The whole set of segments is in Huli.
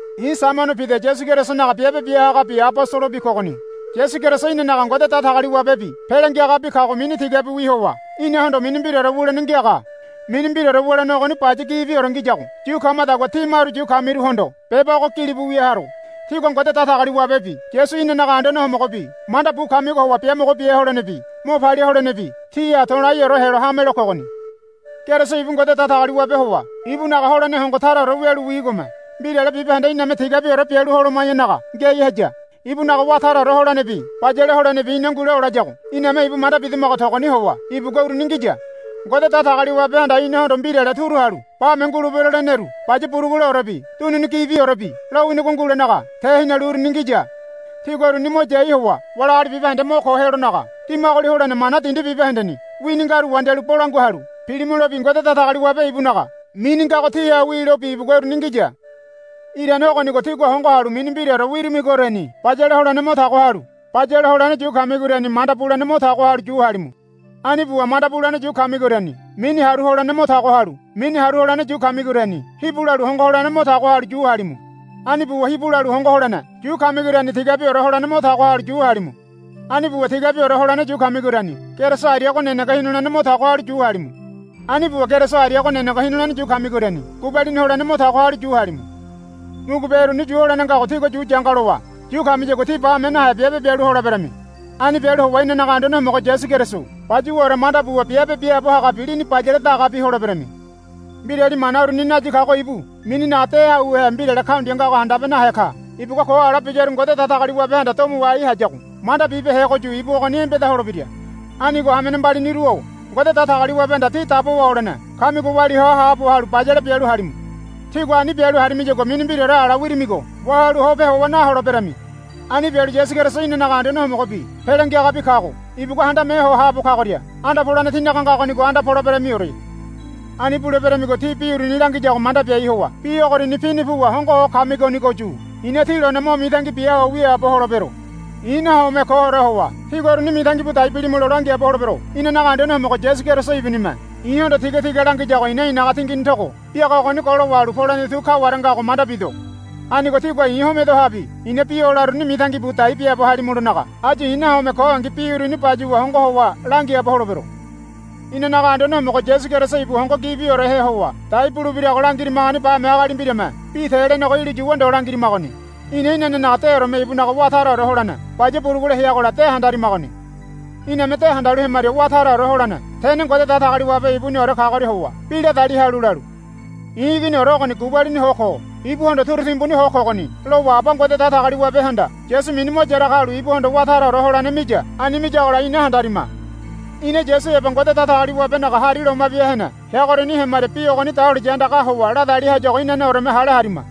I̱ Saimono Pida Yasu Kerisonaga biabe bia hagabi abosolobi kogoni. Yasu Keriso inanaga Ngode Datagaliwabebi Pele Ngiagabi kago mini tigabiwi howa inahondo mini mbiraore wulene ngiaga. Mini mbiraore wulene ogoni baya gibiore ngiyago yu kamadagua tí maru yu kamiruhondo beba ogo gilibu wia haro. Tígua Ngode Datagaliwabebi Yasu inanaga Anduane Homogobi manda bu kamigo howa biamogo bia holenebi mo palia holenebi tíha to̱laiore helo hamelo kogoni. Keriso ibu Ngode Datagaliwabe howa ibunaga holene hongo taraore wialu wigome mbirale bibahende iname tigabiore bialu holoma̱yanaga ngiai haya. Ibunaga wá taraore holenebi bayale holenebi ina ngule olayago iname ibu manda bidamago togoni howa ibugua uruni ngiya. Ngode Datagaliwabehanda inahondo mbirale turu halu bame ngulebero leneru baya buruguleorebi dunini gibiorebi lowinigo ngulenaga tehinalu uruni ngiya. Tígua uruni mo yai howa wali agali bibahende mo ko helonaga dimagoli holene mana dindi bibahendeni wini ngaru wandialu bolangua halu pilimulobi Ngode Datagaliwabe ibunaga mini ngago tíha wilobi ibugua uruni ngiya. Irane ogonigo tígua hongo halu mini mbiraore wirimigoriani bayale holene mo tago halu bayale holene yu kamigoriani manda bulene mo tago halu yu halimu. Ani buwa manda bulene yu kamigoriani mini haru holene mo tago halu mini haru holene yu kamigoriani hibu lalu hongo holene mo tago halu yu halimu. Ani buwa hibu lalu hongo holene yu kamigoriani tigabiore holene mo tago halu yu halimu. Ani buwa tigabiore holene yu kamigoriani Keriso ariago nenege hinulene mo tago halu yu halimu. Ani buwa Keriso ariago nenege hinulene yu kamigoriani gubalini holene mo tago halu yu halimu. Mugube uruni yu holene ngago tígua yu yanga lowa yu kamiyagua tí bame nahe biabe bialu holeberami. Ani bialu howa inanaga Anduane Homogo Yasu Keriso bayuwaore manda buwa biabe biaabo hagabi lini bayale dagabi holeberami. Mbirali mana uruni nayi kago ibu mininaga de auhe mbirale kaundia ngago handabe nahe ka. Ibugua ko ala biyaru Ngode Datagaliwabehanda domo wahai hayago manda bibehegoyu ibu ogoni embeda holebira. Anigo hamene mbaliniru-o Ngode Datagaliwabehanda tí dabowa olene kamigo walia hoa haabo halu bayale bialu halimu. Tígua ani bialu harimiyagua mini mbiraore ala wirimigo wahalu hope howa naholeberami. Ani bialu Yasu Keriso inanaga Anduane Homogobi Pele Ngiagabi kago ibugua Handame Ho Haabo Kagoria anda polene tínaga ngagonigo anda poleberamiore. Ani buleberamigo tí bi uruni langiyago manda biai howa bi ogoriani pini puwa hongo ho kamigonigoyu i̱na tí lone mo mitangi bia ho wiaabo holebero. I̱ nahome koore howa tígua uruni mitangi bu dai bilimulo langiaabo holebero. Inanaga Anduane Homogo Yasu Keriso ibunime i̱hondo tigatiga langiyago i̱na i̱naga tingini togo biaga ogoni golo wahalu polene tu kaware ngago manda bido. Anigo tígua i̱ homedohabi i̱na bi o laroruni mitangi bu dai biaabo halimulonaga áyu i̱ nahome kongi bi uruni bayuwa hongo howa langiaabo holebero. Inanaga Anduane Homogo Yasu Keriso ibu hongo gibiorehe howa dai bulebirago langirimagoni bame agali mbirame bi te lenego ilu yuwa ndo langirimagoni. Ina inanenaga deoreme ibunaga wá taraore holene baya burugule heagola de handarimagoni. Iname de handalu hemaria Wá Taraore Holene Tene Ngode Datagaliwabe Ibuniore kagoria howa bi ladali halu lalu. I̱ Iginiore ogoni gubalini ho ko. Ibuhondo turu timbuni ho kogoni, lowa Aba Ngode Datagaliwabehanda Yasu mini mo yaraga halu ibuhondo wá taraore holene miya. Ani miyagola ina handarima. Ina Yasu heba Ngode Datagaliwabenaga hari loma bia hene heagoriani hemaria bi ogoni dahuliya andagaha howa la dali hayago inanemeore hale harima.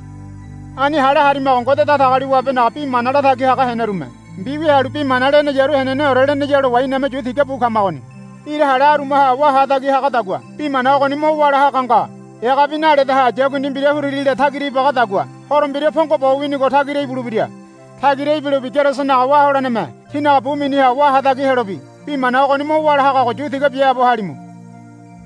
Ani hale harimago Ngode Datagaliwabenaga bi mana latagi haga henerume mbiwia halu bi mana leneyaru heneneore leneya lowa iname yu tiga bu kamagoni. Ira hale arumaha wá hatagi hagadagua bi mana ogoni mo wála haga nga. Egabi naledaha yakundi mbira huririle tagira ibagadagua Horo Mbira pongo bo winigo tagira ibulebira. Tagira ibilobi Kerisonaga wá holeneme tínaga bu miniha wá hatagi helobi bi mana ogoni mo wála hagago yu tiga biaabo halimu.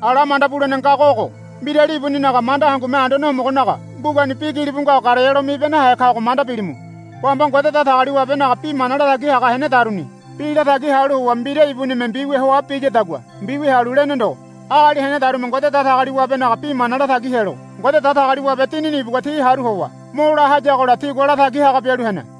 Ala manda bulene ngago ogo. Mbirali ibuninaga manda hangume Anduane Homogonaga mbugani bi gilibu ngago garealo mibe nahe kago manda bilimu. Bamba Ngode Datagaliwabenaga bi mana latagi haga henedaruni bi latagi halu howa mbira ibunime mbiwia hoa biyadagua mbiwia halu lene ndo. Agali henedarume Ngode Datagaliwabenaga bi mana latagi helo Ngode Datagaliwabe Dinini ibugua ti haru howa mo la hayagola tigua latagi haga bialu hene.